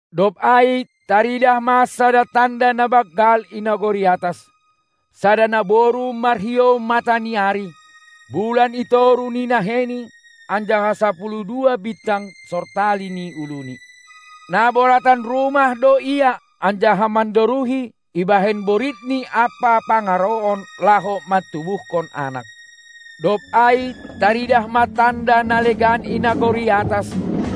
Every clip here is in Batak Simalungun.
Dob ai taridah ma sada tanda na banggal i nagori atas: Sada naboru marhiou mata ni ari, bulan i toruh ni naheini anjaha sapuluh dua bintang sortali ni uluni. Na boratan rumah do ia anjaha mandoruhi ibahen boritni ampa pangarouon laho mantubuhkon anak. Dob ai taridah ma tanda na legan i nagori atas: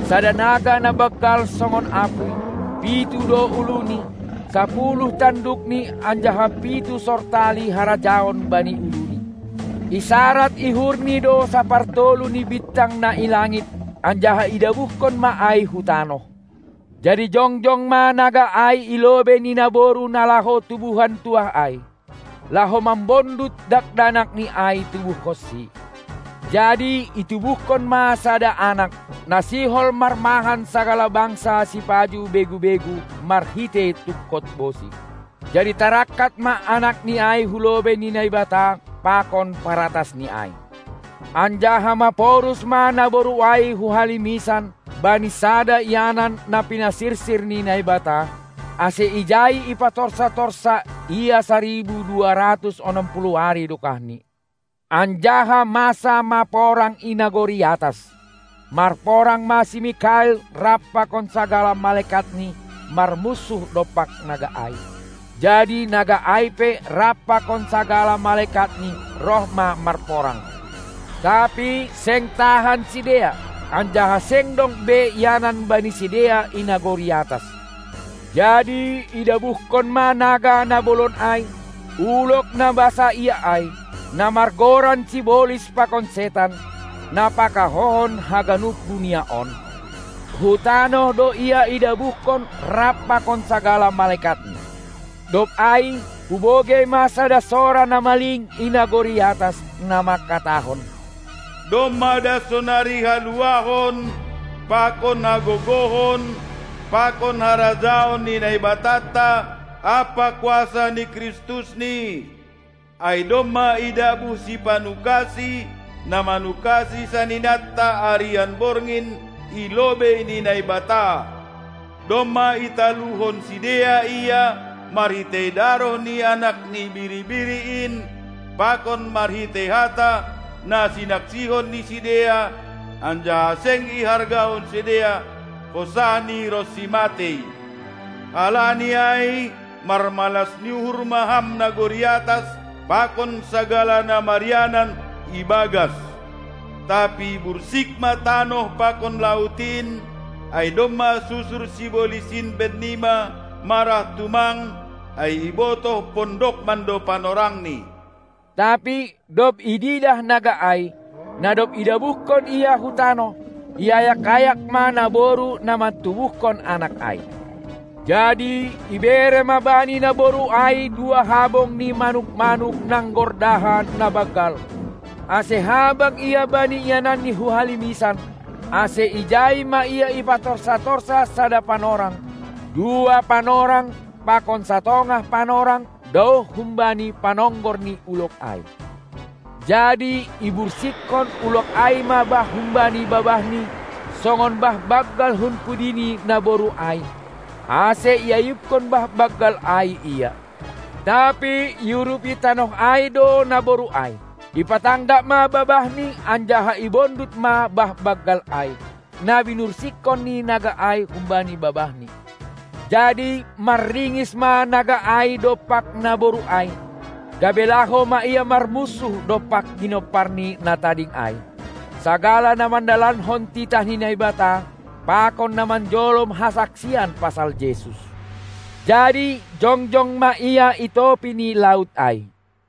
Sada naga na banggal songon apuy, pitu do uluni, sapuluh tandukni anjaha pitu sortali harajaon bani uluni. Isarad ihurni do sapartolu ni bintang na i langit anjaha idabuhkon ma ai hu tanoh. Jadi jongjong ma naga ai i lobei ni naboru na laho tubuhan tuah ai, laho mambondut dakdanakni ai tubuhkonsi. Jadi itubuhkon ma sada anak, na sihol marmahan sagala bangsa sipajuh begu-begu marhitei tungkot bosi. Jadi tarangkat ma anakni ai hulobei ni Naibata pakon paratasNi ai, anjaha maporus ma naboru ai hu halimisan bani sada ianan na pinasirsir ni Naibata, ase ijai ipatorsa-torsa ia saribu dua ratus onom puluh ari dokahni. Anjaha masa ma porang i nagori atas; marporang ma si Mikael rap pakon sagala malekatni marmunsuh dompak naga ai. Jadi naga ai pe rap pakon sagala malekatni roh ma marporang. Tapi seng tahan sidea, anjaha seng dong be ianan bani sidea i nagori atas. Jadi idabuhkon ma naga na bolon ai, ulog na basaia ai, na margoran sibolis pakon setan, na pakahouhon haganup dunia on; hu tanoh do ia idabuhkon rap pakon sagala malekatni. Dob ai hubogei ma sada sora na maling i nagori atas, na manghatahon: Domma das sonari haluahon pakon hagogohon pakon harajaon ni Naibatanta ampa kuasa ni KristusNi; ai domma idabuh sipanukasi, na manukasi saninanta arian borngin i lobei ni Naibata. Domma italuhon sidea ia marhitei daroh ni Anak ni Biri-biri in pakon marhitei hata na sinaksihon ni sidea, anjaha seng ihargahon sidea hosahni ronsi matei. Halani ai marmalas ni uhur ma ham nagori atas pakon sagala na marianan ibagas! Tapi bursik ma tanoh pakon laut in, ai domma susur sibolis in bennima, marah tumang, ai ibotoh pondok mando panorangni. Tapi dob ididah naga ai, na dob idabuhkon ia hu tanoh, iayak-ayak ma naboru na mantubuhkon anak ai. Jadi ibere ma bani naboru ai dua habong ni manuk-manuk nanggordaha na banggal, ase habang ia bani iananni hu halimisan, ase ijai ma ia ipatorsa-torsa sada panorang, dua panorang pakon satongah panorang daoh humbani panonggor ni ulog ai. Jadi ibursikkon ulog ai ma bah humbani babahni songon bah banggal hun pudi ni naboru ai, ase iayubkon bah banggal ai ia. Tapi iurupi tanoh ai do naboru ai, ipatanggak ma babahni anjaha ibondut ma bah banggal ai, na binursikkon ni naga ai humbani babahni. Jadi manringis ma naga ai dompak naboru ai, gabe laho ma ia marmunsuh dompak ginomparni na tading ai, sagala na mandalankon titah ni Naibata pakon na manjolom hasaksian pasal Jesus. Jadi jongjong ma ia i topi ni laut ai.